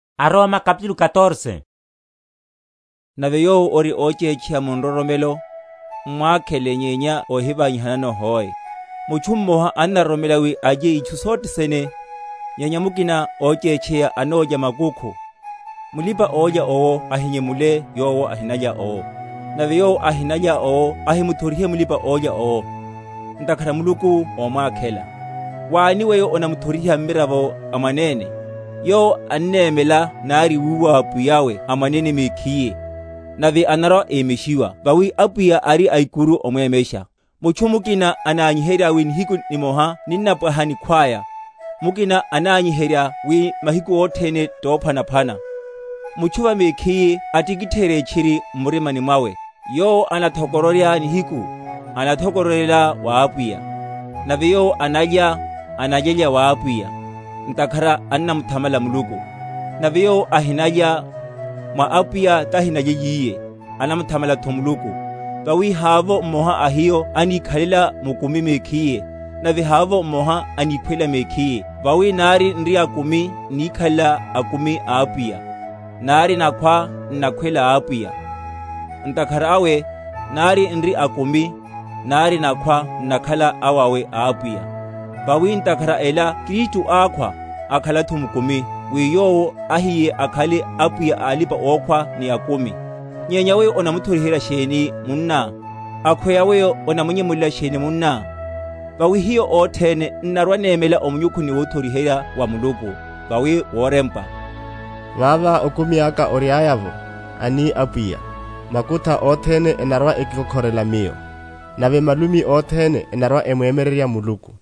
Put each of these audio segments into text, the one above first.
Ovilelano alipa‐ochétcheya. Nave yowo ori óchétcheya mu nroromelo, m’mwakhele nyenya óhivanyihanano hoe. Mutchu mmoha annaroromela wi alye itchu sothe sene, nyenya mukina óchétcheya anólya makukhu. Mulipa‐olya owo ahinyemule yowo ahinalya owo; nave yowo ahinalya owo ahimuthorihe mulipa‐olya owo; ntakhara Muluku ómwakhela. Wani weyo onamuthoriha mmiravo a mwanene? Yowo annemela nari wuwa wa pwiya’we a mwanene mekhiye. Nave anarwa‐emeshiwa; vawi Apwiya ari aikuru omwemesha. Mutchu mukina anányiherya wi nihiku nimoha ninnapwaha nikhwaya; mukina anányiherya wi mahiku othene tophwanaphwana. Mutchu va mekhiye atikitheryeye tchiri m’murimani mwawe. Yowo anathokororya nihiku, anathokororyela wa Apwiya: nave yowo analya, analyelya wa Apwiya, ntakhara annamuthamala Muluku; nave yowo ahinalya, mwa Apwiya tahinalyelyiye, anathamalatho Muluku. Vawi havovo mmoha a hiyo anikhalela mukumi mekhiye, nave havovo mmoha aníkhwela mekhiye. Vawi nari n’ri akumi, n’nikhalela akumi Apwiya; nari nakhwa, n’nakhwela Apwiya; ntakhara awe nari n’ri akumi, nari nakhwa n’nakhala awawe a Apwiya. Vawi, ntakhara a ela Kristu ákhwa, akhalatho mukumi, wi Yowo ahiye akhale Apwiya a alipa‐okhwa ni akumi. Nyenya weyo onamuthoriherya sheni munná? Akhweya weyo onamunyemulela sheni munná? Vawi hiyo othene n’narwa‐nemela o munyukhuni wothoriherya wa Muluku. Vawi worempwa, Vava okumi aka oriaya’vo, ani Apwiya, makutha othene enarwa‐ekikokhorela Miyo, Nave malumi othene enarwa‐emwemyererya Muluku.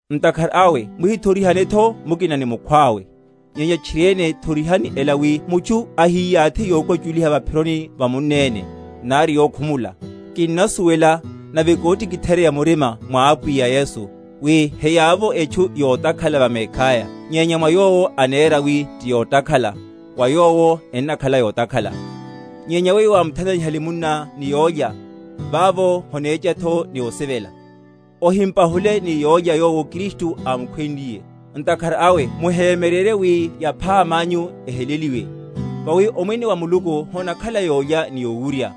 Ntakhara awe nihithorihanetho mukina ni mukhwawe; nyenya tchiriene thorihani ela, wi mutchu ahiyathi yokwachuliha va’phironi ya munneni, nari yokhumula. Kinnasuwela, nave kotikitheryeya murima mwa Apwiya Yesu, wi heyavovo etchu yotakhala va mekhaya; nyenya mwa yowo anera wi tiyotakhala, wa yowo ennakhala yotakhala. Nyenya weyo wámuthananihale munná ni yólya, vavo honechechatho ni osivela. Ohimpahule ni yólyá, yowo Kristu ámukhwenliye. Ntakhara awe muhemyererye wi yaphama anyu eheleliwe. Vawi Omwene wa Muluku honakhala yólya ni yowurya,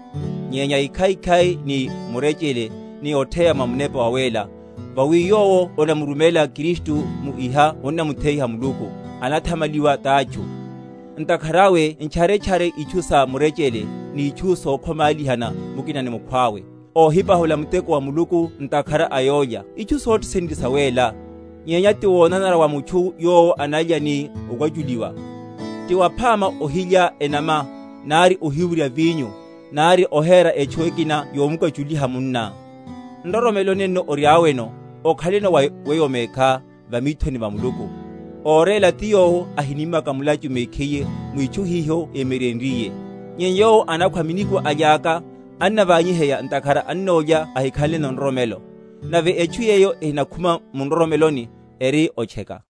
nyenya ekhaikhai ni murechele, ni otheya mwa Munepa Wawéla. Vawi yowo onamurumela Kristu mu iha onnamutheyiha Muluku, anathamaliwa tátchu. Ntakhara awe ntcharetchare itchu sa murechele, ni itchu sokhomálihana mukina ni mukhwawe. Ohinapahula muteko wa Muluku ntakhara a yólya. Itchu sothe sene ti sawéla; nyenya ti wonanara wa mutchu yowo analya ni okwachuliwa. Ti waphama ohilya enama, nari ohiwurya vinyo, nari ohera etchu ekina yomukwachuliha munná. Nroromelo nenlo oriáno, okhaleno wa weyo mekhá va mithoni va Muluku. Óréla ti yowo ahinímaka mulachu mekhiye mwitchu hiho émyeryenryiye. Nyenya yowo anakhwa minikwa alyaka, annaványiheya, ntakhara annolya ahikhanleno nroromelo; nave etchu yeyo ehinakhuma mu nroromelo, eri otcheka.